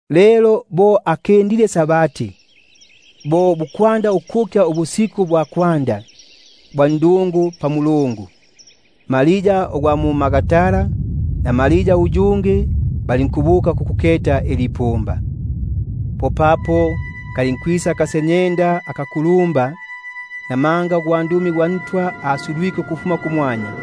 Lelo bo amalike Sabati, bo bukwanda ukukya ubusiku bwa isiku lya kwanda lya ndungu, popapo Maria gwa mu-Magdala na Maria uyungi yula, balinkwisa kukuketa ilipumba. Popapo kalinkwisa akasenyenda akakulumba; namanga ugwandumi gwa Ntwa asulwike ukufuma kumwanya,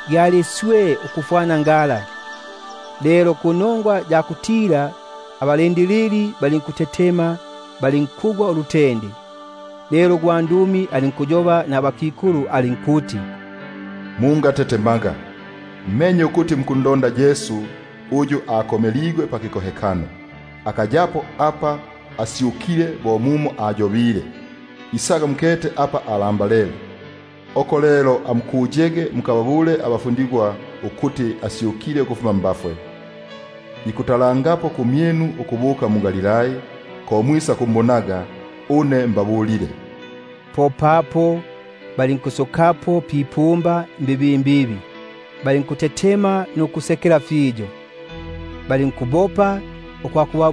gyali swe bo ingala. Panongwa ya kuntila, abalindilili balinkutetema, balinkuya bo abandu abafwe. Umwene ugwandumi alinkubabula abakikulu bala alinkuti: Umwe mwe mungatetemaga, buno menye ukuti mukundonda Yesu uyu akomeligwe pakikohekano; akayapo apa, namanga asyukile, bo apa ayobile; isaga mukete apa balindambalike. Amubukege lelo mbibimbibi, mukababulege abafundigwa bake ukuti asyukile mbafwe; keta, ikubalongolelangapo ukubuka mu-Galilai, mo mwisakwakumbonaga. Keta, mbabulile. Popapo balinkusokako kwipumba mbibimbibi, balinkongania nulutende nulusekelo lu lwingi; balinkubopa balinkwakuba-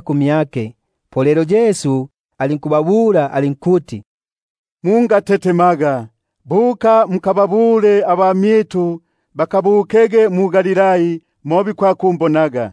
lukila. Popapo Yesu alinkubabula alinkuti: Mungatetemaga, amubukege mukababulege abamyitu babukege mu-Galilai, mo bikwakumbonaga.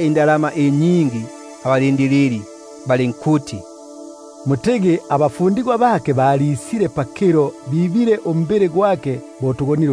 indalama si nyingi, balinkubabula balinkuti: Amutigi, abafundigwa bake bisile pakilo, bamwibile bo uswe tugonile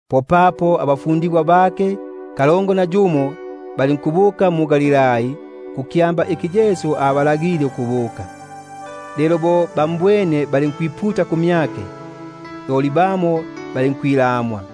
Loli abafundigwa kalongo na yumo bala, balinkubuka mu- Galilai, kukyamba kikyo Yesu abalagile. Abene bo ba-mbwene, balinkumbungulukila, loli bamo balinkwilamwa.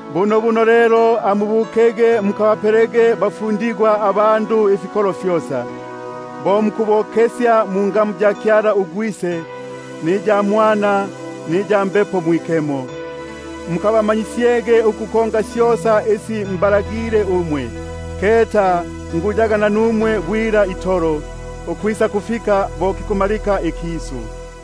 Popapo lelo amubukege mukabapelege bafundigwa abandu ifikolo fyosa, mukabokesyege mungamu ya Kyala uGwise, niya Mwana, niya Mbepo Mwikemo; mukabamanyisyege ukukonga syosa isi mbalagile umwe; keta une ndipo nanumwe bwila, ukwakufika na kubumalikilo ikisu.